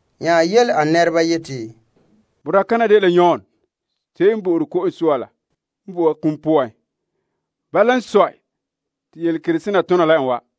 nya yele a nɛreba yeti, Boraa kana dela Yon Ko'sɔɔra la n vo'e a kum poan! Bala n sɔe te yelekerehe sena tona la en wa.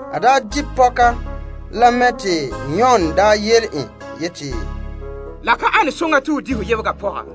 A daa di' pɔka la mɛ te Yon daa yele en yeti, La ka nare te ho di' ho yebega pɔga.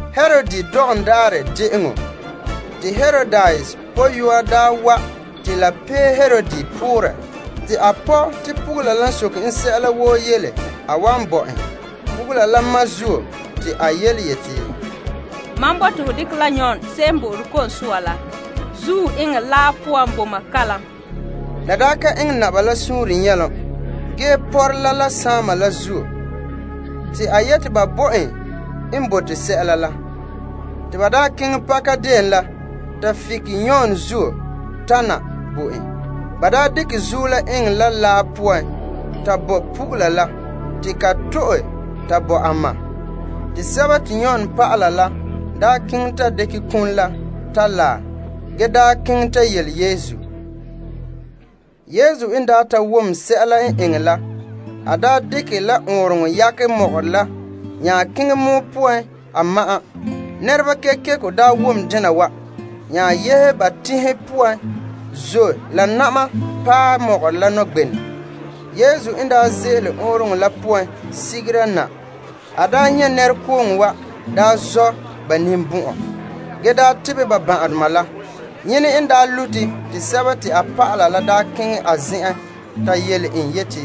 Herod dɔgɔm daarɛ de'eŋɔ la te Herodias pɔyɔa daa wa' te la pee Herod poorɛ, te a pɔ' te pugula la n soke en sɛla woo yele a wan bo en. Pugula la ma yele ka te a yeti, Mam bote ho dekɛ la Yon Ko'sɔɔra la zuo eŋɛ laa poan bo mam kalom. La ka eŋɛ naba la suunre nyɛlom ge n pɔrɛ la la saama la zuo, a yeti ba bo en n bote sɛla la. Te ba keŋɛ pakadeen la ta fike Yon zuo la ge dekɛ zuo la eŋɛ la laa poan ta bo pugula la te ka to'e ta bo a ma. Yon dɔlɔba la keŋɛ ta dekɛ kum la ta laɛ, ge keŋɛ ta yele Yesu. Yesu n daa ta wom sɛla n eŋɛ la, a dekɛ la ɔɔnrɔŋɔ yakɛ mɔgɔrɛ la nya keŋɛ pɔgɔtia poan a ma'an. Nɛreba kekeko wom dena wa, nya yehe ba teŋhe poan zɔ' la na'ma paɛ mɔgɔrɛ nɔgbenɛ. Yesu n ze'ele ɔɔnrɔŋɔ la poan sigera na, a nyɛ' nɛrekooŋɔ wa zɔ' ba ninbɔn'ɔn ge tebɛ ba ban'ahedoma la. Yene n daa ma'ɛn te a dɔlɔba la keŋɛ a zen'en ta yele en yeti,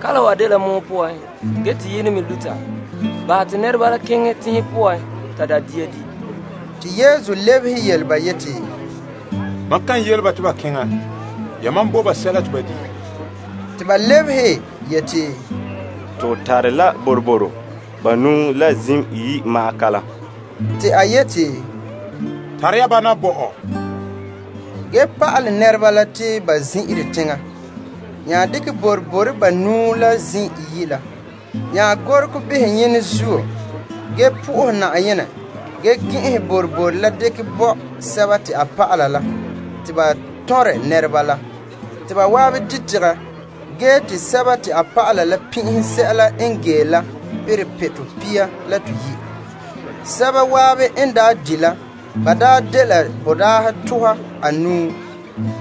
Kalam wa dela pɔgɔtia poan, ge te yenɛ me luta. Bahɛ te nɛreba la keŋɛ teŋhe poan ta da' dia di'. Te Yesu lebehe yele ba yeti, Mam kan yele ba te ba keŋɛ. Yamam bo ba sɛla te ba di'. Te ba lebehe yeti, To tare la boroboro banuu la zim iyi' ma'an kalam. Te a yeti, Tare ya ba na bo mam. Ge te a pa'ale nɛreba la te ba zin'ire teŋa. A dekɛ boroboro banuu la la zim iyi' la nya behɛ saazuo ge bo Na'ayenɛ fara ge gɛn'ɛnhɛ boroboro la nya dekɛ bo a dɔlɔba la te ba tɔnrɛ nɛreba la. Ba zan'an di' tegɛ gee te dɔlɔba la pin'ihe sɛla n gee la perɛ pitɔ pia la toyi'. Sɛba zan'an n di' la dela boraahe tuha anuu,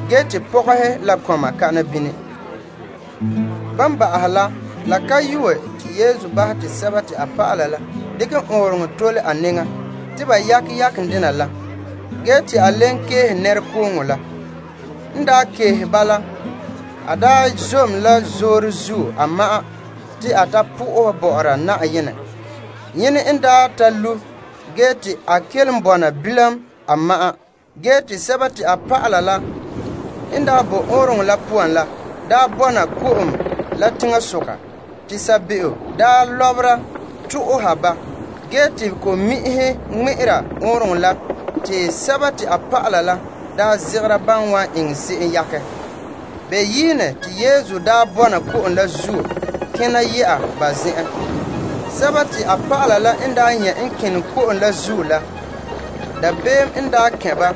ge pɔgɔhe la kɔma pa'ahɛ. La ka yue te Yesu daa bahɛ te a dɔlɔba la dekɛ ɔɔnrɔŋɔ tole a nɛŋa te ba yakɛ yaken dena la ge te enŋa leen keehe nɛrekooŋɔ la. N daa keehe ba la, a zom la zoore zuo a ma'an te a ta sohɛ Na'ayenɛ. Zaanɔɔrɛ n paɛ te a kelom bɔna bilam a ma'an. Ge ɔɔnrɔŋɔ la, te a dɔlɔba la n daa kɛn' bɔna ko'om la teŋasoka, te sabeeo lɔbera to'oha ba ge te ko'mi'inhe ŋmɛ'ɛra ɔɔnrɔŋɔ la te a dɔlɔba la zegera ban wan eŋɛ se'em yakɛ. Beyiine te Yesu daa bɔna ko'om la zuo kena yɛ'a ba zen'en. A dɔlɔba la n nyɛ' en kene ko'om la zuo la, dabeem n kɛn' ba,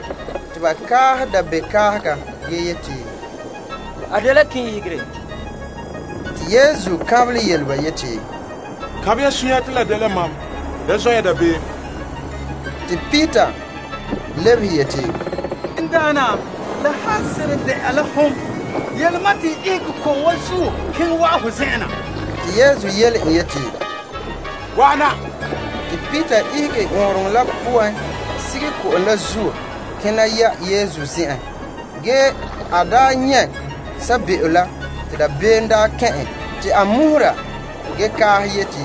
te ba kaahɛ dabeem kaahega ge yeti, A dela kɔkɔ. Te Yesu kaanbelɛ yele ba yeti, Kaanbɛ ya sunya te la dela mam. Da zɔ' ya dabeem. Te Peter lebehe yeti, N Daana, la han seren de'a la hom, yele mam te n ihege ko'om wa zuo keŋɛ wa'an ho zen'en na. Te Yesu yele en yeti, Wa'ana. Te Peter ihege ɔɔnrɔŋɔ la poan sige ko'om la zuo kena yɛ'a Yesu zen'en. Ge en nyɛ' sabeeo la, dabeem kɛn' en te a muhura ge kaaha yeti,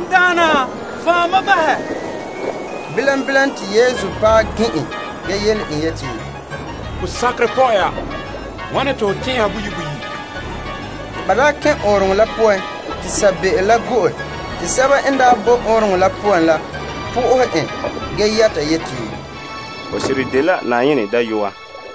N Daana, fan' mam bahɛ. Bilam bilam te Yesu paɛ gin' en ge yele en yeti, Ho sakerɛ pɔ'ɛ ya! Wane te ho tɛn'ɛha boyi' boyi'? Te ban kɛn' ɔɔnrɔŋɔ la poan, sabeeo la go'e. Te bama n boe ɔɔnrɔŋɔ la poan la na'ahe en ge yɛta yeti, Ho seren dela Na'ayenɛ Dayɔa.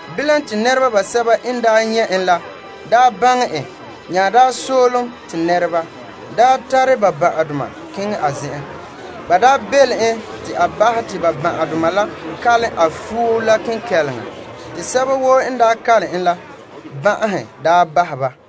Te teŋa la nɛreba n nyɛ' en ge baŋɛ en, ba nya soolom te teŋhe woo nɛreba tare ba ban'ahedoma wa'an a zen'en. Ba daa belom en te a bahɛ te ban'ahedoma la kalom a fuo la kenkɛleŋa, te sɛba woo n daa kalom en la ban'ahe daa bahɛ ba.